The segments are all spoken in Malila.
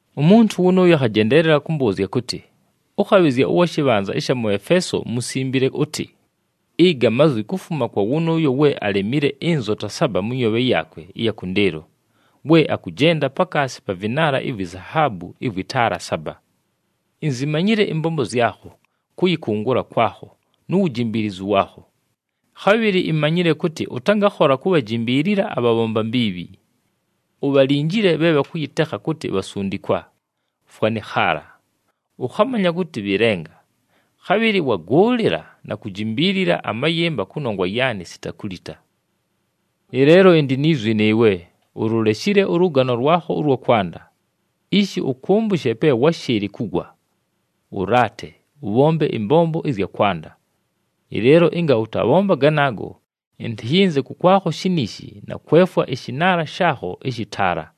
Umuntu wʉnʉʉyo akhajendeelela kʉmbʉʉzya kʉtɨ, “Ʉkhabhɨzya ʉwa shɨbhanza ɨsha mʉ Efeeso musimbile ʉtɨ: Ɨga mazwi kufuma kwa wʉnʉʉyo we alemile ɨnzota saba mʉ nyoobhe yaakwe ɨya kʉndɨɨlo, we akʉjenda pakaasi pa vɨnaala ivwi zahaabu ɨvwɨ taala saba. Inzimanyile ɨmbombo zyakho, kʉyɨkʉngʉla kwakho, nu wujimbiilizu waakho. Khabhɨlɨ imanyile kʉtɨ ʉtangakhola kubhajimbiilila abhabhomba mbiibhi. Ubhalinjile bhe bhakʉyɨtekha kʉtɨ bhasundikwa, fwanɨ khaala. Ʉkhamanya kʉtɨ bhɨ lenga. Khabhɨlɨ wagʉʉlɨla na kujimbiilila amayɨmba kʉnongwa yaanɨ sita kulita. Ɨleelo ɨndɨ ni zwi nɨɨwe: ululeshile ʉlʉgano lwakho ʉlwa kwanda. Ishi ʉkʉmbʉshe pe wáshɨɨlɨ kugwa! Ʉlaate, ʉbhombe ɨmbombo ɨzya kwanda. Ɨleelo ɨnga ʉtabhomba ganaago, ɨntɨyɨnze kʉkwakho shiniishi na kwefwa ɨshɨnaala shaakho ɨshɨ taala.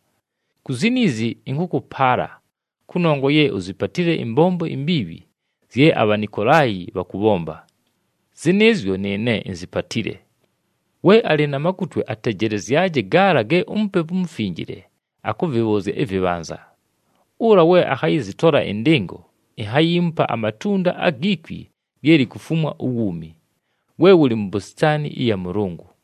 Ku ziniizi ɨnkʉkʉpaala, kʉnongwa ye uzipatile ɨmbombo imbiibhi zye aBhanikolaayi bhakʉbhomba. Zɨnɨɨzyo nɨɨne inzipatile. We alɨ na makutwe atejelezyaje gaala ge uMupepu uMufinjile akʉvɨbhʉʉzya ɨvɨbhanza. Ʉla we akhayɨzɨtola ɨndɨngo inhayiimupa amatunda agi kwi lye likufumwa uwuumi, we wʉlɨ mu bositaani ɨya Mʉlʉngʉ.”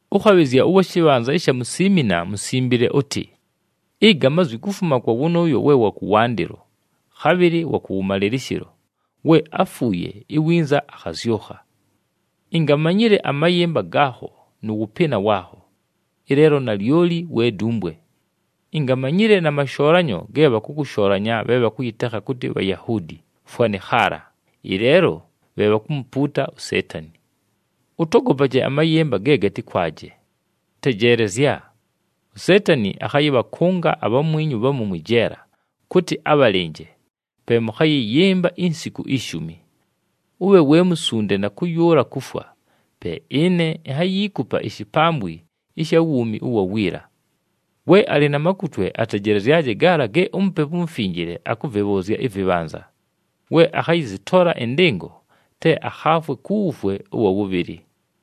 “Ʉkhabhɨzya ʉwa shɨbhanza ɨsha mu Siimina musimbile ʉtɨ: Ɨga mazwi kufuma kwa wʉnʉʉyo we wa kʉwandɨlo, khabhɨlɨ wa kʉwʉmalɨlɨshɨlo, we áfuuye, iwinza akhazyʉkha. Ingamanyile amayɨmba gaakho nʉ wʉpɨɨna waakho. Ɨleelo nalyoli we dumbwe! Ingamanyile na mashoolanyo ge bhakʉshoolanya bhe bhakʉyɨtekha kʉtɨ Bhayahuudi, fwanɨ khaala, ɨleelo bhe bhakumupuuta uSeetani. Ʉtogopaje amayɨmba ge gatɨkwaje. Tejeelezya! USeetani akhayɨbhakʉnga abhamwinyu bhamu mwɨ jeela kʉtɨ abhalɨnje, pe mʉkhayɨyɨmba insiku ishumi. Ʉbhe we musunde na kʉyʉʉla kufwa, pe ɨne inhayiikupa ishipambwi ɨsha wuumi ʉwa wiila. We alɨ na makutwe atejelezyaje gaala ge uMupepu uMufinjile akʉvɨbhʉʉzya ɨvɨbhanza. We akhayɨzɨtola ɨndɨngo, te akhaafwe ku wufwe ʉwa wʉbhɨlɨ.”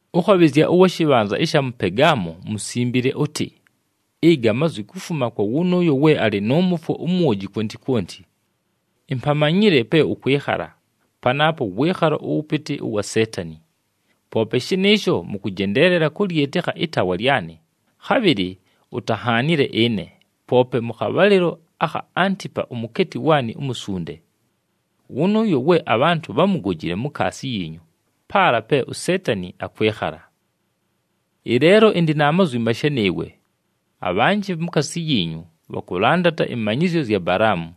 “Ʉkhabhɨzya ʉwa shɨbhanza ɨsha mʉ Pegaamo musimbile ʉtɨ: Ɨga mazwi kufuma kwa wʉnʉʉyo we alɨ nʉ mʉfwo umwoji kwonti kwonti. Impamanyile pe ʉkwɨkhala, panaapo wɨɨkhalo ʉwʉpɨtɨ ʉwa Seetani. Poope shɨnɨɨsho, mʉkʉjendeelela kʉlyɨtɨkha ɨtaawa lyanɨ, khabhɨlɨ utanhaanile ɨne, poope mʉ khabhalɨlo akha Antipa umukeeti waanɨ umusunde. Wʉnʉʉyo we abhantʉ bhámugojile mukaasi yiinyu paala pe uSeetani akwɨkhala. Ɨleelo ɨndɨ na mazwi mashe nɨɨwe: abhanjɨ mukaasi yiinyu bhakʉlandata ɨmanyɨzyo zya Balaamu.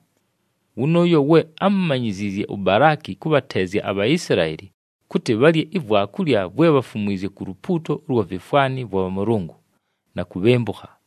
Wʉnʉʉyo we ámumanyiziizye uBalaaki kʉbhateezya aBhaisilaeli kʉtɨ bhalye ivwakulya vwe bhafumwizye ku lupuuto ʉlwa vifwani vwa bhamʉlʉngʉ na kubhembukha.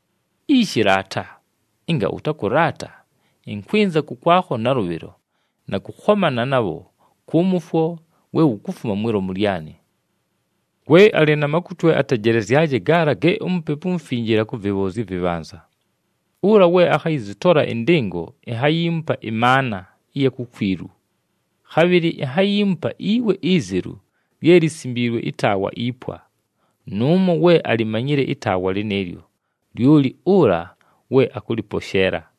Ishi, laata! Ɨnga ʉtakʉlaata, ɨnkwɨnza kʉkwakho nalʉbhɨlo, na kʉkhomana nabho kʉ mʉfwo we wukufuma mwi lomu lyanɨ. We alɨ na makutwe atejelezyaje gaala ge uMupepu uMufinjile akʉvɨbhʉʉzya ɨvɨbhanza. Ʉla we akhayɨzɨtola ɨndɨngo inhayiimupa ɨmaana ɨya kukwilu. Khabhɨlɨ inhayiimupa iwe izelu lye lisimbiilwe ɨtaawa ipwa. Nʉʉmo we alimanyile ɨtaawa lɨnɨɨlyo, lyoli ʉla we akʉlɨposheela.”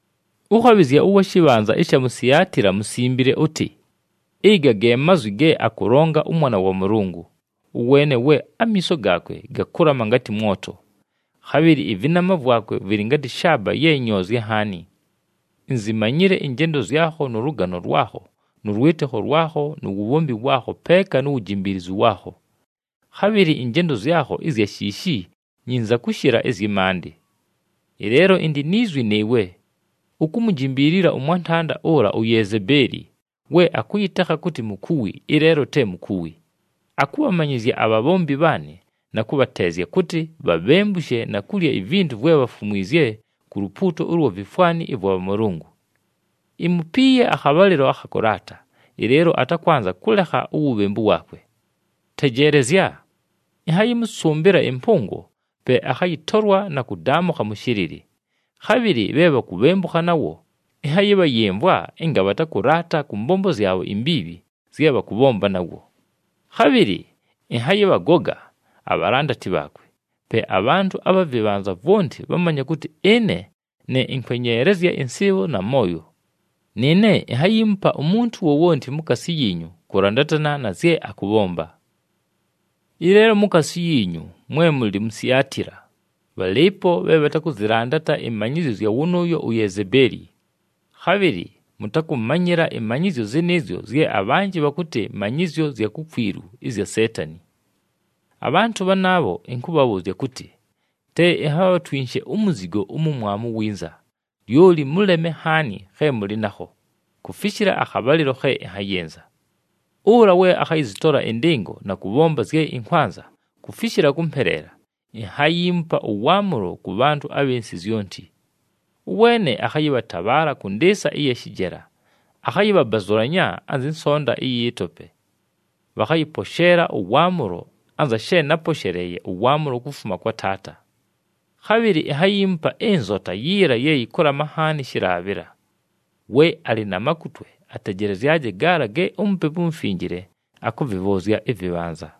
“Ʉkhabhɨzya ʉwa shɨbhanza ɨsha mu Siatila musimbile ʉtɨ: Ɨga ge mazwi ge akʉlonga ʉMwana wa Mʉlʉngʉ, ʉweene we amiiso gaakwe gakʉlama ngatɨ mwoto, khabhɨlɨ ɨvɨnama vwakwe vɨlɨ ngatɨ shaaba ye nyoozye nhaani. Inzimanyile ɨnjendo zyakho nʉ lʉgano lwakho nʉ lwɨtɨkho lwakho nu wubhombi waakho peeka nu wujimbiilizu waakho. Khabhɨlɨ ɨnjendo zyakho ɨzya shiishi nyinza kʉshɨla ɨzyɨ maandɨ. Ɨleelo ɨndɨ ni zwi nɨɨwe: ukumujimbiilila ʉmwantanda ʉla uYezebeeli, we akʉyɨtekha kʉtɨ mukuwi, ɨleelo te mukuwi. Akʉbhamanyɨzya abhabhombi bhaanɨ na kʉbhateezya, kʉtɨ bhabhembushe na kulya ivintu vwe bhafumwizye ku lupuuto ʉlwa vifwani ɨvwa bhamʉlʉngʉ. Imupiiye akhabhalɨlo akha kʉlaata, ɨleelo atakwanza kʉlekha uwubhembu waakwe. Tejeelezya! Ɨnhayɨmʉsʉmbɨla ɨmpʉngo, pe akhayɨtolwa na kʉdaamʉkha mʉ shɨlɨlɨ. Khabhɨlɨ bhe bhakubhembukha nawo ɨnhayɨbhayɨmvwa ɨnga bhatakʉlaata kʉ mbombo zyabho imbiibhi zye bhakʉbhomba nawo. Khabhɨlɨ ɨnhayɨbhagoga abhalandati bhaakwe. Pe abhantʉ abha vɨbhanza vwonti bhamanye kʉtɨ ɨne ne ɨnkwenyeelezya ɨnsɨɨbho na mooyo. Nɨɨne inhayiimupa umuntu wowonti mukaasi yiinyu kʉlandatana na zye akʉbhomba. Ɨleelo mukaasi yiinyu, mwe mʉlɨ mu Siatila, bhalɨɨpo bhe bhatakʉzɨlandata ɨmanyɨzyo zya wʉnʉʉyo uYezebeeli. Khabhɨlɨ mʉtakʉmanyɨla ɨmanyɨzyo zɨnɨɨzyo zye abhanjɨ bhakʉtɨ manyɨzyo zya kukwilu ɨzya Seetani. Abhantʉ bhanaabho ɨnkʉbhabhʉʉzya kʉtɨ: te inhabhatwinshe umuzigo umumwamu winza, lyoli mʉleme nhaani khe mʉlɨ nakho, kufishila akhabhalɨlo khe ɨnhayɨnza. Ʉla we akhayɨzɨtola ɨndɨngo na kʉbhomba zye ɨnkwanza kufishila kʉmpeleela, ‘Inhayiimupa ʉwaamʉlo kʉ bhantʉ abhɨ nsɨ zyonti. Ʉweene akhayɨbhatabhaala kʉ ndɨɨsa ɨya shɨjela, akhayɨbhabazʉlanya anzɨ nsonta ɨyɨ tope.’ Bhakhayɨposheela ʉwaamʉlo anza she náposheleeye ʉwaamʉlo kufuma kwa Taata. Khabhɨlɨ inhayiimupa ɨnzota yiila ye yɨkʉlama nhaani shɨlaabhɨla. We alɨ na makutwe atejelezyaje gaala ge uMupepu uMufinjile akʉvɨbhʉʉzya ɨvɨbhanza.”